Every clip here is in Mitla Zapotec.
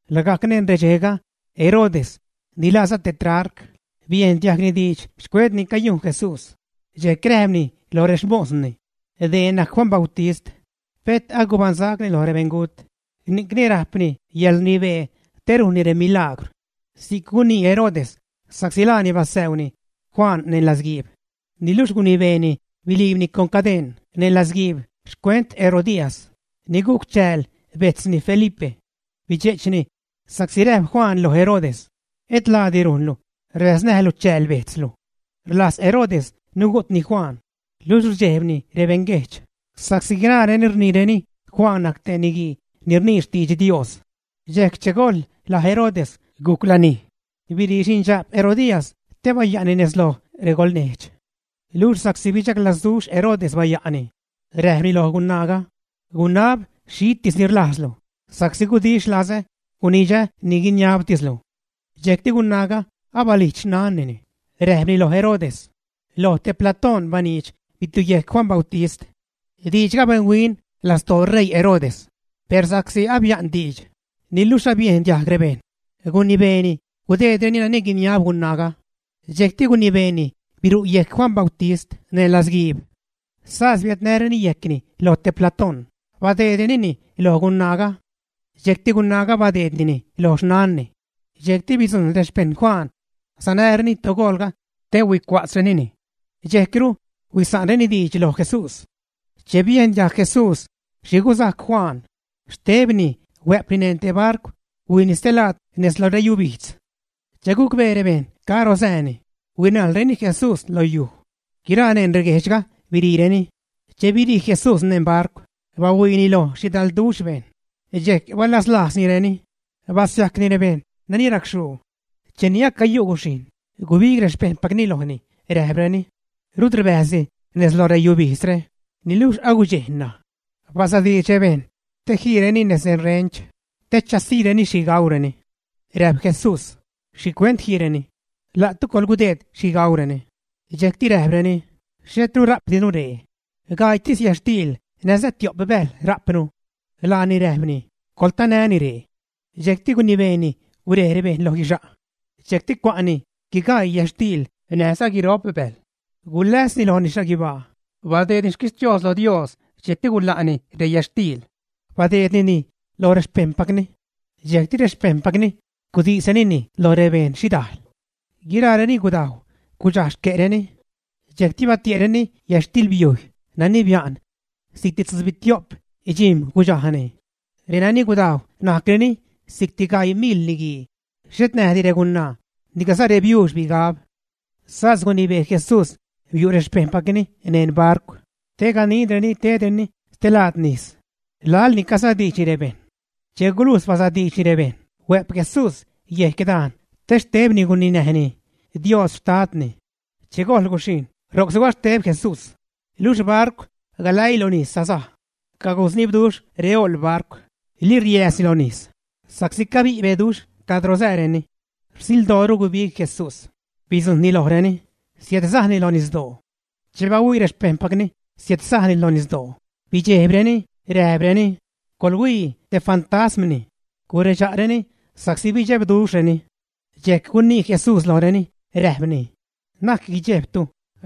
Lagajc neṉ redxejga Herodes, ni laaza tetrarca, biejn diajgni diidx xcuent ni cayujn Jesús. Dxejc räjpni lo rexmosni: ―Dee najc Juan Bautist. Pet agubaṉsacni lo rebeṉgut, ni'cni rajpni yäḻrnibee te rujnni remilagwr. Si'c gunii Herodes sa'csi laani basäuuni Juan neṉ latzguiib. Niluxh gunibeeni biliibni con cadeṉ neṉ latzguiib xcuent Herodías, ni gujc chääl bejtzni Felipe. Bidxe'chni sa'csi räjp Juan lo Herodes: ―Et laadi rujnlu rbäznäjlu chääl bejtzlu. Rlajz Herodes nugu'tni Juan, luxh rdxejbni rebeṉguejdx, sa'csi guiraareni rniireni Juan najc te niguii ni rnii xtidx Dios. Dxejc che gojl laj Herodes gujc lanij, birii xindxa'p Herodías te baya'ni nez loj regolnejdx. Luxh sa'csi bidxaglazduxh Herodes baya'ni, räjpni loj gunaaga: ―Gunab xhitis ni rlajzlu, sa'csi gudix lazä gunidxä ni guiniabtislu. Dxejcti gunaaga, abalijdx xnannini, räjpni lo Herodes: ―Loj te platóṉ baniidx bitiuyejc Juan Bautist. Diidxga benhuin lastoo ṟeii Herodes, per sa'csi abia'n diidx, niluxh abiejn diajg rebejṉ, gunibeeni gudeedreni nani guiniab gunaaga. Dxejcti gunibeeni biru' yejc Juan Bautist neṉ latzguiib. Sas biädnäreni yejcni lo te platóṉ, badeedrenini loj gunaaga. Dxejcti gunaaga badeednini lo xnanni. Dxejcti bidzujṉ rexpejṉ Juan sanäreni togoolga te huicua'tzrenini. Dxejcru huisa'nreni diidx loj Jesús. Che biejn diajg Jesús xhi guzajc Juan, xtebni huä'pni neṉ te barcw huijni stee laad nez lo reyubijdz. Che gucbee rebejṉ caro sääni, huinajlreni Jesús lo yuj. Guiraa neṉ reguejdxga biriireni. Che birii Jesús neṉ barcw, bahuiini loj xhidalduxh bejṉ, dxejc balazlajznireni, basiajcni rebejṉ nani racxhuu. Cheni acayu' guxhijṉ, gubig rexpejṉpacni lojni räjpreni: ―Rut rbäjzdi nez lo reyubijdzre, niluxh agudxej ṉaj. Basadiidx rebejṉ te jiireni nez rerench te chasiireni xhi gaureni. Räjp Jesús: ―Xhicuent jiireni. La'tu coḻgudeed xhi gaureni. Dxejcti räjpreni: ―Xhetru rajpdinu ree. Gaiitis yätxtiil näjza tio'p bäjl rajpnu. Laani räjpni: ―Coḻtanäni ree. Dxejcti gunibeeni gurej rebejṉ lo guixa'. Dxejcti cua'ni guigaii yätxtiil näjza guiro'p bäjl, guläsni lojni xhaguibaa, badeedni xquixhtios lo Dios, dxejcti gula'ni reyätxtiil. Badeednini loj rexpejṉpacni. Dxejcti rexpejṉpacni gudisrenini loj rebeṉ xhidajl. Guiraareni gudajw, gudxaj xque'reni. Dxejcti batie'reni yätxtilbiujy nani bia'n. Si'cti tzubitio'p dxijm̲ gudxajni. Renani gudajw najcreni si'cti gaii miḻ niguii, xhet näjdi regunaa niclaza rebiuux bigab. Sas gunibee Jesús biu' rexpejṉpacni neṉ barcw te ganidreni tedreni stee lad nis laḻni casadiidxni rebejṉ. Che gulujx basadiidxni rebejṉ, huä'p Jesús yecdajn te xtebni guninäjni Dios Xtadni. Che gojl guxhijṉ, ro'c sugaxteb Jesús. Luxh barcw galäii lo nis sasaj. Cagusnibduxh reoḻ barcw, liriääzni lo nis sa'csi cabi' beduxh cadro sääreni. Rsildooru gubig Jesús, bidzujṉni lojreni, siädsajni lo nisdoo. Che bahuii rexpejṉpacni siädsajni lo nisdoo, bidxejbreni, räjpreni: ―Coḻhuii te fantasmni ―guredxa'reni sa'csi bidxebduxhreni. Dxejc gunii Jesús lojreni, räjpni: ―Na'c guidxejbtu,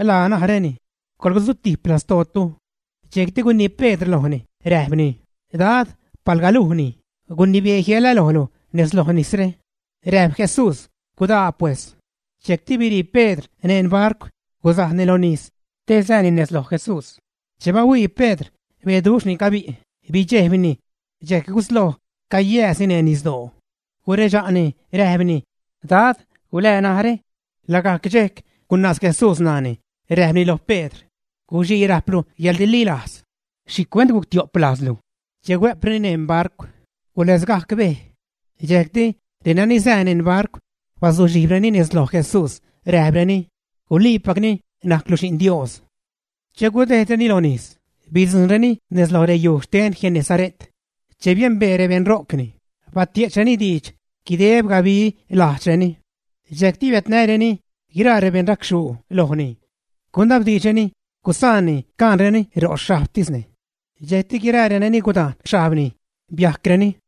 laa naräni; coḻsutijp lastootu. Dxejcti gunii Pedr lojni, räjpni: ―Dad, palga lujni, gunibee jiälä lojlu nez lo nisre. Räjp Jesús: ―Gudaa pues. Dxejcti birii Pedr neṉ barcw gusajni lo nis te sääni nez loj Jesús. Che bahuii Pedr beduxh ni cabi', bidxejbni, dxejc gusloj cayääzni neṉ nisdoo. Guredxa'ni, räjpni: ―Dad, ¡gulää narä! Lagajc dxejc gunaaz Jesús ṉaani, räjpni loj Pedr: ―Guxii rajplu yäḻrililajz. ¿Xhicuent guctio'p lajzlu? Che huä'preni neṉ barcw, guläzgajc bej. Dxejcti renani sää neṉ barcw bazuxhijbreni nez loj Jesús räjpreni: ―Guliipacni najclu Xi'n Dios. Che gudejdreni lo nis, bidzujṉreni nez lo reyuj xten Genesare't. Che biembee rebeṉ ro'cni, batie'chreni diidx guideb gabi lajdxreni. Dxejcti biädnäreni guiraa rebeṉ racxhuu lojni. Gunabduxhreni gusaanni caṉreni ro' xhajbtisni. Dxejcti guiraa renani gudajn xhajbni, biajcreni.